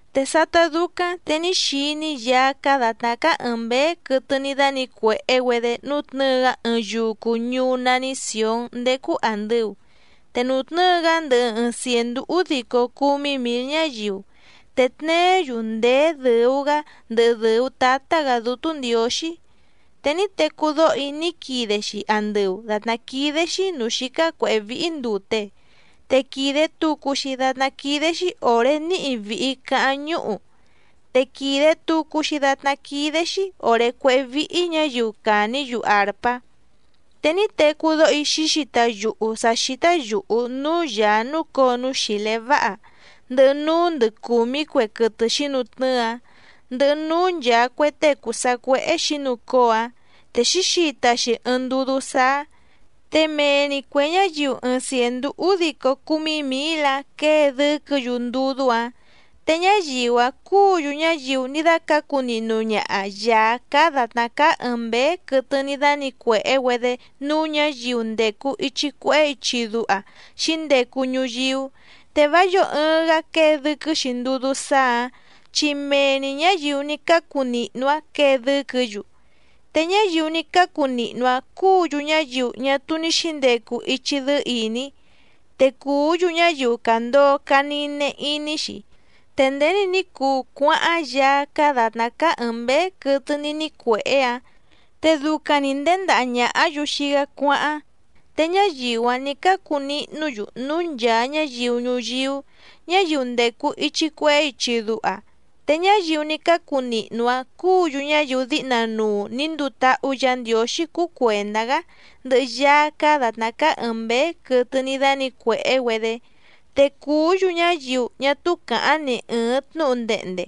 Te sátá dúcáⁿ te ní xiní‑í Yaá cáá dàtná cáá ɨ̀ɨⁿ mbéé quɨtɨ ní dánǐcuèhé‑güedé nútnɨ̌ɨ‑gá ɨɨⁿ yucu ñuú nání Sìón ndécú àndɨu, te nutnɨ́ɨ‑gá ndɨhɨ ɨɨⁿ cièndú údico cúmí mǐl ñáyiu, te tneé‑yu ndèé dɨ̀u‑gá ndɨhɨ dɨ̀u tátá‑gǎ Dútú Ndiǒxí. Te ní tecú dóho‑í ní quide‑xi andɨu dàtná quídé‑xí nǔú xícá cuěhé víhí ndùte, te quìde tucu‑xi datná quídé‑xí òré níhi vìhi caháⁿ ñúhu, te quìde tucu‑xi datná quídé‑xí òré cuéhé víhí ñǎyiu càní‑yu àrpá. Te ní tecú dóho‑í xǐxita yuhu sǎ xítá yùhu núú Yàá núcǒo núú xìlé váha, ndɨhɨ núú ndɨ cùmí cue quɨtɨ xǐnutnɨ́ɨ‑áⁿ, ndɨhɨ núú nchàa cue tée cùu sacuéhé xǐnucóo‑áⁿ, te xǐxita‑xi ɨɨⁿ ndudú sáá. Te mee‑ni cuè ñáyiu ɨɨⁿ cièndú údico cúmí mǐl‑áⁿ quěe dɨ́quɨ̌‑yu ndudú‑áⁿ, te ñáyiu‑áⁿ cúǔ‑yu ñáyiu ní dácǎcu nihnu ñaha Yàá cáá dàtná cáá ɨ̀ɨⁿ mbéé quɨtɨ ní dánǐcuèhé‑güedé núú ñǎyiu ndècu ichi cuehé ichi duha xǐndecu ñuyíú, te vá yǒo ɨɨⁿ‑gá quěe dɨ́quɨ́‑xi ndudú sáá‑ǎⁿ chi mee‑ni ñǎyiu ní cácu nihnu‑áⁿ quěe dɨ́quɨ̌‑yu. Te ñáyiu ní cácu nihnu‑áⁿ cúǔ‑yu ñáyiu ñá túú ní xǐndecu ichi dɨ́ɨ́ ìní, te cùú‑yu ñáyiu càndoo canine iní‑xi, te nděni ní cuu cuáháⁿ Yaá cáá dàtná cáá ɨ̀ɨⁿ mbéé quɨtɨ ní nícuèhé‑áⁿ, te ducaⁿ‑ni nděndaha ñàhá‑yu xii‑gá cuáháⁿ, te ñáyiu‑áⁿ nǐ cácu nihnú‑yu núú nchàa ñáyiu ñuyíú, ñáyiu ndècu ichi cuehé ichi duha, te ñáyiu ní cácu nihnu‑áⁿ cúǔ‑yu ñáyiu díhna nuu nǐ nduu táhú Yǎ Ndiǒxí cuu cuèndá‑gá ndɨhɨ Yaá cáá dàtná cáá ɨ̀ɨⁿ mbéé quɨtɨ ní dánǐcuèhé‑güedé. Te cùú‑yu ñáyiu ñá túú càháⁿ ni ɨ̀ɨⁿ tnúhu ndehnde,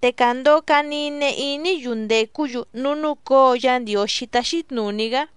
te càndoo canine iní‑yu ndècú‑yu núú núcǒo Yá Ndiǒxí táxí tnùní‑gá.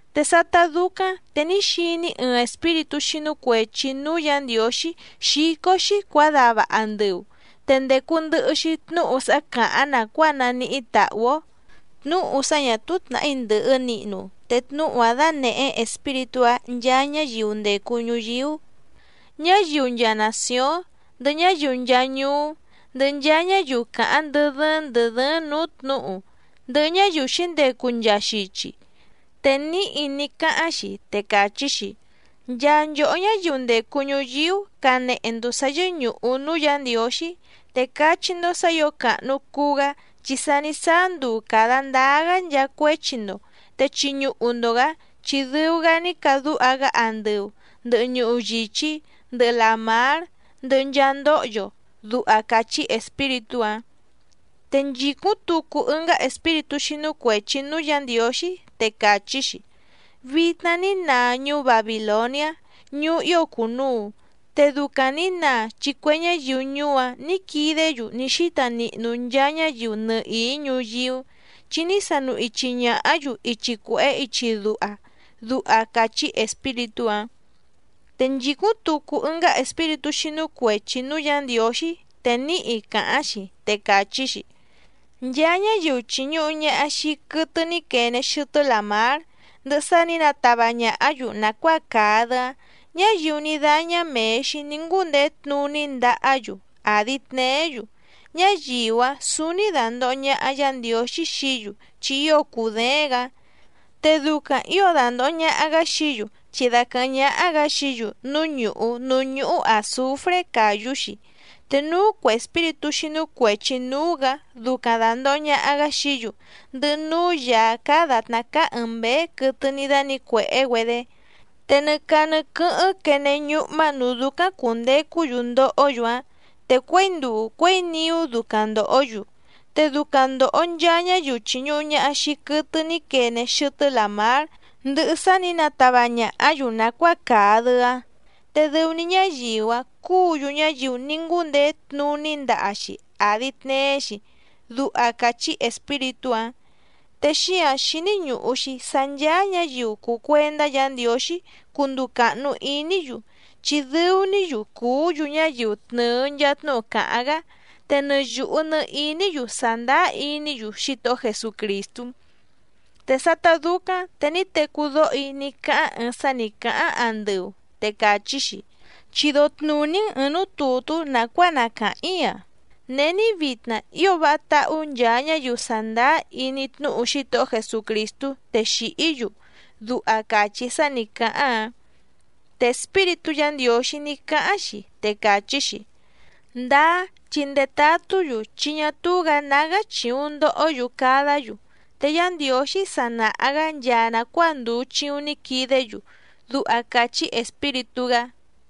Te sátá dúcáⁿ te ní xiní‑í ɨɨⁿ espíritú xínú cuèchi núú Yǎ Ndiǒxí xícó‑xí cuǎdava andɨu, te ndècu ndɨhɨ‑xi tnúhu sá càháⁿ nàcuáa naníhí tàhú‑ó, tnúhu sá ñà túú tnàhí ndɨ̀hɨ nihnu te tnúhu‑áⁿ danèhé espíritú‑aⁿ nchaa ñáyiu ndècu ñuyíú, ñáyiu nchaa nàcióⁿ, ndɨhɨ ñáyiu nchaa ñuú, ndɨhɨ nchaa ñáyiu càháⁿ ndɨ́ dɨ́ɨ́ⁿ ndɨ̀ dɨ́ɨ́ⁿ nǔú tnǔhu, ndɨhɨ ñáyiu xǐndecu nchaa xichi. Te níhi ní cáháⁿ‑xi te càchí‑xi: —Nchaa nchòhó ñáyiu ndècu ñuyíú canehe‑ndo sǎ yɨ́ñùhu núú Yǎ Ndiǒxí, te cachí‑ndó sǎ ǐo càhnu cuu‑gá chi sa ní sáá nduu càda ndáá‑gá nchaa cuéchi‑ndo, te chiñuhu‑ndo‑gǎ chi dɨu‑gá ní cadúha‑gá andɨu, ndɨhɨ ñuhu yìchí, ndɨhɨ làmár, ndɨhɨ nchaa ndóhyo —duha càchí espíritú‑áⁿ. Te nchìcúⁿ tucu ɨngá espíritú xínú cuèchi núú Yǎ Ndiǒxí, te càchí‑xi: —Vitna ní naa ñuú Babìloniá ñuú ío cùnuu, te ducaⁿ nǐ naa chi cue ñáyiu ñuú‑áⁿ nǐ quidé‑yu ní xíta nihnu nchaa ñáyiu nɨhìí ñuyíú, chi ní sanu ichi ñàhá‑yu ichi cuèhé ichi duha —duha càchí espíritú‑áⁿ. Te nchìcúⁿ tucu ɨngá espíritú xínú cuèchi núú Yǎ Ndiǒxí te níhi càháⁿ‑xi, te càchí‑xi: —Nchaa ñáyiu chìñuhu ñaha xii quɨtɨ ní quene xɨtɨ́ làmár, ndɨhɨ sá nǐ natava ñàhá‑yu nàcuáa càa‑dɨ‑áⁿ, ñáyiu ní dáñá mèe‑xi ní ngúndeé tnuní ndahá‑yu àdi tneé‑yu, ñáyiu‑áⁿ sǔúní dàndoho ñaha Yá Ndiǒxí xií‑yu chi ío cùdééⁿ‑gǎ, te ducaⁿ ǐo dandòho ñaha‑gá xií‑yu chi daquɨ̀hɨ́ⁿ ñáhá‑gǎ xií‑yu núú ñùhú núú ñúhú àzufré càyú‑xi, te núú cuè espíritú xínú cuèchi núú‑gǎ ducaⁿ dàndoho ñaha‑gá xií‑yu, ndɨhɨ núú Yàá cáá dàtná cáá ɨ̀ɨⁿ mbéé quɨtɨ ní dánǐcuèhé‑güedé. Te nɨ caa nɨ quɨ́hɨ́ⁿ quene ñúhmá nǔú dúcáⁿ cùndecú‑yu ndohó‑yu‑áⁿ, te cuěi nduu cuěi niú ducaⁿ ndòhó‑yu. Te ducaⁿ ndòho nchaa ñáyiu chìñuhu ñaha xii quɨtɨ ní quene xɨtɨ́ làmár, ndɨhɨ sá nǐ natava ñàhá‑yu nàcuáa càa‑dɨ‑áⁿ, te dɨu‑ni ñáyiu‑áⁿ cúǔ‑yu ñáyiu ní ngúndeé tnuní ndaha‑xi àdi tneé‑xi —duha càchí espíritú‑áⁿ. Te xíǎⁿ xíní ñùhu‑xi sá ncháá ñǎyiu cùu cuendá Yǎ Ndiǒxí cunduu càhnu iní‑yu, chi dɨu‑ní‑yu cùú‑yu ñáyiu tnɨ̀ɨ nchaa tnúhu càháⁿ‑gá, te nɨ yùhu nɨ iní‑yu sàndáá iní‑yu Xítohó Jesucrìstú. Te sátá dúcáⁿ te ní tecú dóho‑í ní cáháⁿ ɨɨⁿ sá nǐ cáháⁿ andɨu, te càchí‑xi: —Chido tnùní‑n ɨ̀ɨⁿ núú tùtú nàcuáa na càháⁿ‑í‑a. “Není vitna ío váha táhú nchaa ñáyiu sàndáá iní tnúhu Xítohó Jesucrìstú te xìhí‑yu” —duha càchí sá nǐ cáháⁿ‑áⁿ. Te Espíritú Yǎ Ndiǒxí ní cáháⁿ‑xi, te càchí‑xi: —Ndáá, chi ndetatú‑yu chi ñá túú‑gǎ nágá chìuⁿ ndohó‑yu cadá‑yu, te Yá Ndiǒxí sa nàha‑gá nchaa nàcuáa ndùu chiuⁿ ní quidé‑yu —duha càchí Espíritú‑gá.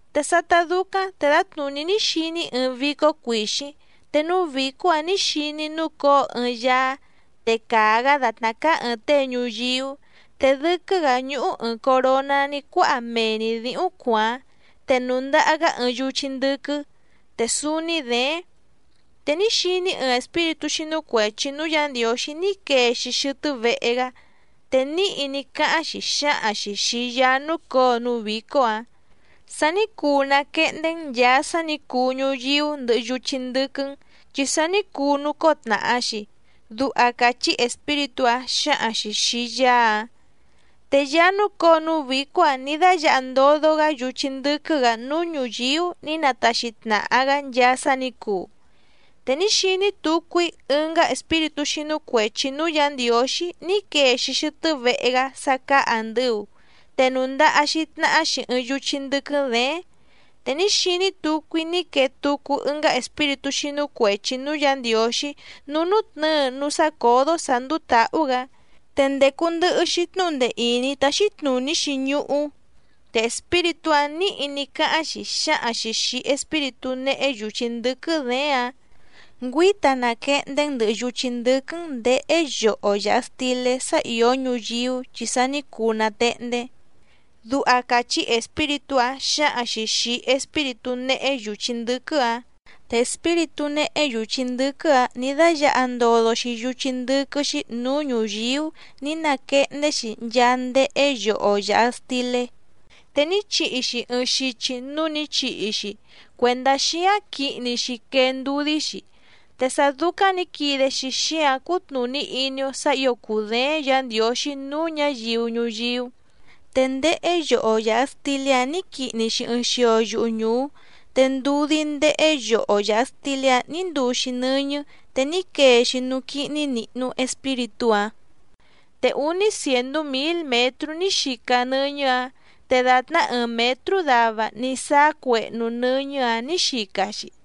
Te sátá dúcáⁿ te dǎtnùní ní xiní‑í ɨɨⁿ vícó cuìxíⁿ, te núú vǐcó‑ǎⁿ nǐ xiní‑í núcǒo ɨɨⁿ Yaá, te càa‑gá dàtná cáá ɨ̀ɨⁿ tée ñuyíú, te dɨ́quɨ́‑gǎ ñúhú ɨ̀ɨⁿ coroná ní cuáha mee‑ni dǐhúⁿ cuàáⁿ, te nùndaha‑gá ɨɨⁿ yuchí ndɨ́quɨ́ te súúní děéⁿ. Te ní xiní‑í ɨɨⁿ espíritú xínú cuèchi núú Yǎ Ndiǒxí ní quee‑xi xɨtɨ́ vehe‑gá, te níhi ní cáháⁿ‑xi xǎhaⁿ‑xi xìi Yaá núcǒo núú vǐcó‑ǎⁿ: —Sa ní cuu nàquehndé‑n nchàa sá nǐ cuu ñuyíú ndɨhɨ yuchí ndɨ́quɨ́‑n, chi sa ní cuu nucóo tnàha‑xi —duha càchí espíritú‑áⁿ xǎhaⁿ‑xi xìi Yaá‑áⁿ. Te Yaá núcǒo núú vǐcó‑ǎⁿ nǐ dáyǎha ndodo‑gá yuchí ndɨ́quɨ́‑gǎ núú ñùyíú nǐ nataxi tnàha‑gá nchaa sá nǐ cuu. Te ní xiní tucu‑í ɨngá espíritú xínú cuèchi núú Yǎ Ndiǒxí ní quee‑xi xɨtɨ́ vehe‑gá sá cáá àndɨu, te nùndaha‑xi tnahá‑xi ɨɨⁿ yuchí ndɨ́quɨ́ děéⁿ. Te ní xiní tucu‑í ní quee tucu ɨngá espíritú xínú cuèchi núú Yǎ Ndiǒxí núú nútnɨ̌ɨ núú sácǒdó sǎ ndúú tǎhú‑gǎ, te ndècu ndɨhɨ‑xi tnúhu ndee ìní táxí tnùní‑xi ñuhú, te espíritú‑áⁿ nǐhi ní cáháⁿ‑xi xǎhaⁿ‑xi xìi espíritú néhé yùchí ndɨ́quɨ́ děéⁿ‑áⁿ: —Ngüíta naquehndé‑n ndɨ̀hɨ yuchí ndɨ́quɨ́‑n nděhé yoho yàha stilé sá ìó ñuyíú chi sa ní cuu nàtehndé —duha càchí espíritú‑áⁿ xǎhaⁿ‑xi xìi espíritú néhé yùchí ndɨ́quɨ́‑ǎⁿ. Te espíritú néhé yùchí ndɨ́quɨ́‑ǎⁿ nǐ dáyǎha ndodo‑xi yuchí ndɨ́quɨ́‑xí nǔú ñùyíú nǐ nàquehndé‑xi nchaa ndéhé yoho yàha stilé, te ní chihi‑xi ɨɨⁿ xichi núú nǐ chihi‑xi cuèndá xíáⁿ quihni‑xi quee ndudí‑xi, te sá dúcáⁿ nǐ quide‑xi xíǎⁿ cútnùní iní‑ó sǎ ǐo cùdééⁿ Yǎ Ndiǒxí núú ñǎyiu ñuyíú. Te ndéhé yoho yàha stilé‑áⁿ nǐ quihni‑xi ɨɨⁿ xio yuhu ñùú, te ndudí ndéhé yoho yàha stilé‑áⁿ nǐ nduu‑xi nɨ́ñɨ́ te ní quee‑xi núú quíhní nìhnu espíritú‑áⁿ. Te úní cièndú mǐl mětrú ní xica nɨ́ñɨ́‑ǎⁿ, te dàtná ɨɨⁿ mětrú dava ní sáá cuehnu nɨ́ñɨ́‑ǎⁿ nǐ xica‑xi.